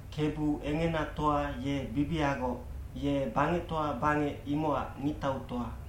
Kebu Engenatoa ye bibiagoc, ye bangectoa bangec imocac ngictautoa.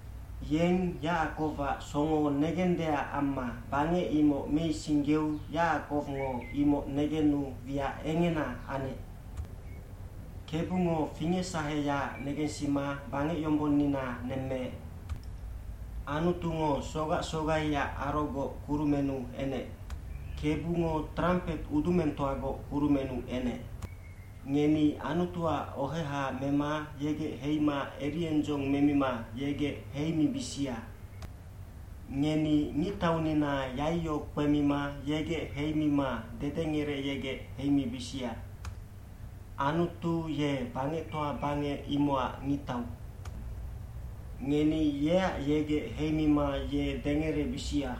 Yeng Yacakowac songo negendeac amma bangec imoc meisinggeu Yacakowngo imoc negenu wiac engena anec. Kebungo fingecsaheyaac negensima bangecyombonnina nemmeec. Anutungo sogac sogaiac arogoc kurumennu enec. Kebungo trampet udumengtoagoc kurumennu enec. Ngeni Anutuac oheha mema yegec heima eriendzong memima yegec heimibisia. Ngeni ngictaunina yaiyo kpemima yegec heimima dedengerecyegec heimibisia. Anutu ye bangectoa bangec imocac ngictau. Ngeni yeac yegec heimima ye dengerebisia.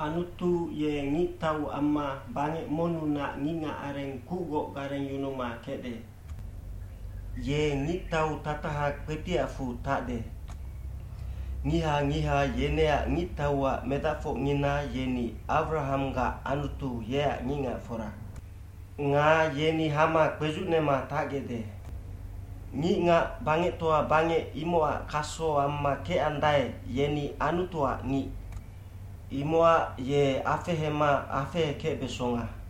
Anutu ye ngictau amma bangec monnunac ngicngacareng kucgoc garengyunuma kecde. Ye ngictau tataha kpetiacfu tacde. Ngiha ngiha yeneac ngictauac medacfocngina yeni Awrahamgac Anutu yeac ngicngacfora. Nga yeni hama kpedzucnema tacgecde. Ngicngac bangectoa bangec imocac kaso amma kecandae, yeni Anutuac ngic. Imocac ye afehema afehekecbesonga.